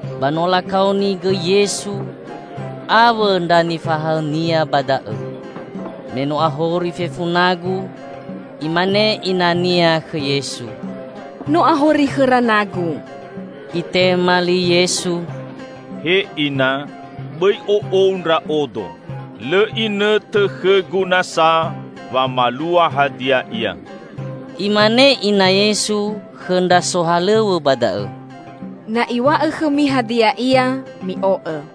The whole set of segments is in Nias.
Ba no lakaoni gõi Yesu awõ ndra nifahaõ-Nia ba da'õ. Me no ahori fefu nagu, imane ina-Nia khõ Yesu, "No ahori khõra nagu." Itema li Yesu, "He Ina, bõi o'ou Ndra'odo. Lõ inõtõ khõ-Gu nasa wamalua hadia ia." Imane ina Yesu khõ ndra sohalõw̃õ ba da'õ, "Na Iw̃a'õ khõmi hadia ia, mi'o'õ."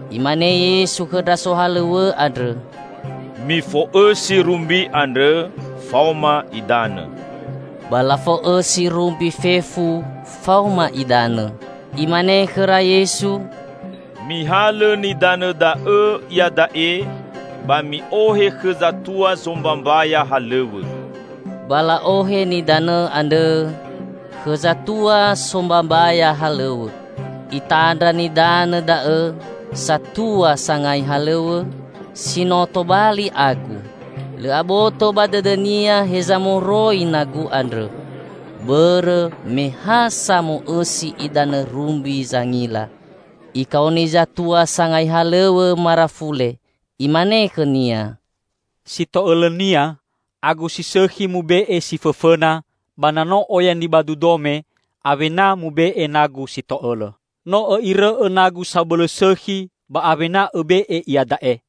Imane Yesu khõ ndra sohalõw̃õ andrõ, "Mifo'õsi rumbi andrõ faoma idanõ." Ba lafo'õsi rumbi fefu faoma idanõ. Imane khõra Yesu, "Mihalõ nidanõ da'õ iada'e ba mi'ohe khõ zatua sombambaya halõw̃õ." Ba la'ohe nidanõ andrõ khõ zatua sombambaya halõw̃õ, itandra nidanõ da'õ satua sangai halõw̃õ, si no tobali agu. (Lõ aboto ba dõdõnia heza moroi nagu andrõ, bõrõ me ha samo'õsi idanõ rumbi zangila.) Ikaoni zatua sangai halõw̃õ marafule, imane khõnia, "Si to'õlõnia agu si sõkhi mube'e si fõfõna, ba na no oya nibadu dome, awena mube'e nagu si to'õlõ. No õ'irõ'õ nagu sabõlõ sõkhi ba awena õbe'e iada'e!"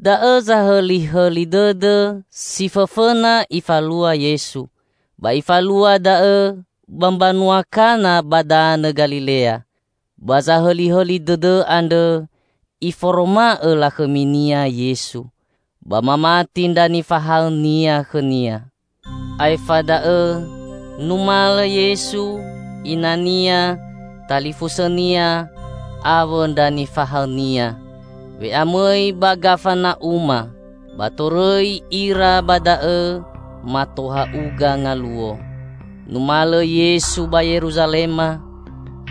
Da'õ zahõlihõli dõdõ si fõfõna nifalua Yesu. Ba Ifalua da'õ ba mbanua Kana ba danõ Galilea. Ba zahõlihõli dõdõ andrõ Iforoma'õ lakhõmi-Nia Yesu. Ba mamati ndra nifahaõ-Nia khõ-Nia. Aefa da'õ numalõ Yesu, ina-Nia, talifusõ-Nia awõ ndra nifahaõ-Nia we'amõi ba Gafana'uma ba torõi ira ba da'õ mato ha'uga ngaluo. Numalõ Yesu ba Yeruzalema,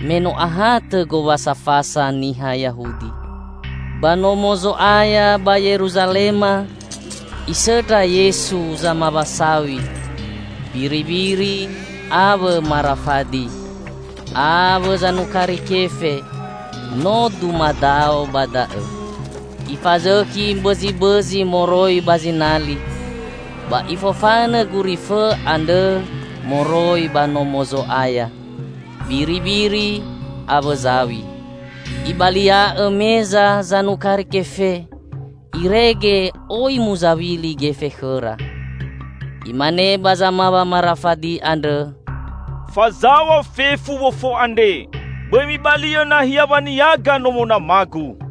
me no ahatõ Gowasa Fasa niha Yahudi. Ba Nomo Zo'aya ba Yeruzalema Isõndra Yesu zamawa saw̃i, biribiri awõ marafadi; awõ zanukari kefe no dumadao ba da'õ. Ifazõkhi mbõzibõzi moroi ba zinali, ba Ifofanõ gurifõ andrõ moroi ba Nomo Zo'aya, biribiri awõ zaw̃i. Ibalia'õ meza zanukari kefe irege oi muzawili gefe khõra. Imane ba zamawa marafadi andrõ, "Fazaw̃a fefu wofo andre. Bõi mibali'õ nahia waniaga Nomo Nama-Gu!"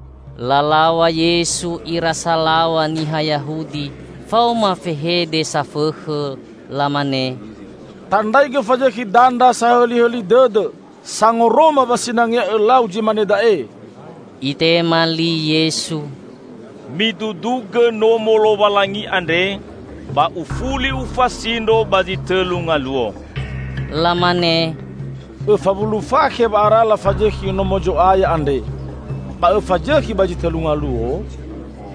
Lalaw̃a Yesu ira salaw̃a niha Yahudi faoma fehede safõkhõ. Lamane, "Tandraigõ fazõkhi dandra sahõlihõli dõdõ sangoroma wa sinangea Õlau zi mane da'e!" Itema li Yesu, "Midudugõ Nomo Lowalangi andre, ba Ufuli Ufasindro ba zi tõlu ngaluo." Lamane, "Õfa wulu fakhe wa'ara lafazõkhi Nomo Zo'aya andre, ba Õfazõkhi ba zi tõlu ngaluo?"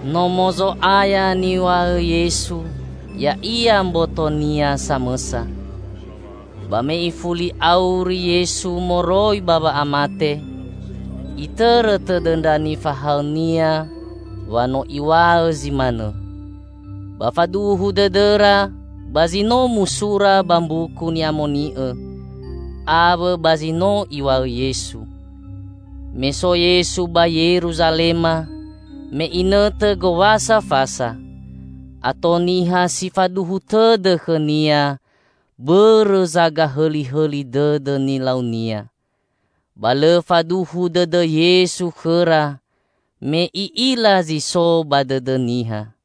Nomo Zo'aya niw̃a'õ Yesu ya'ia mboto-Nia samõsa. Ba me ifuli auri Yesu moroi ba wa'amate, itõrõ tõdõ ndra nifahaõ-Nia wa no Iw̃a'õ zi manõ. Ba faduhu dõdõra ba zi no musura ba Mbuku Ni'amoni'õ, awõ ba zi no Iw̃a'õ Yesu. Me so Yesu ba Yeruzalema me inõtõ Gowasa Fasa, ato niha si faduhu tõdõ khõ-Nia bõrõ zagahõlihõli dõdõ nilau-Nia. Ba lõ faduhu dõdõ Yesu khõra me I'ila zi so ba dõdõ niha.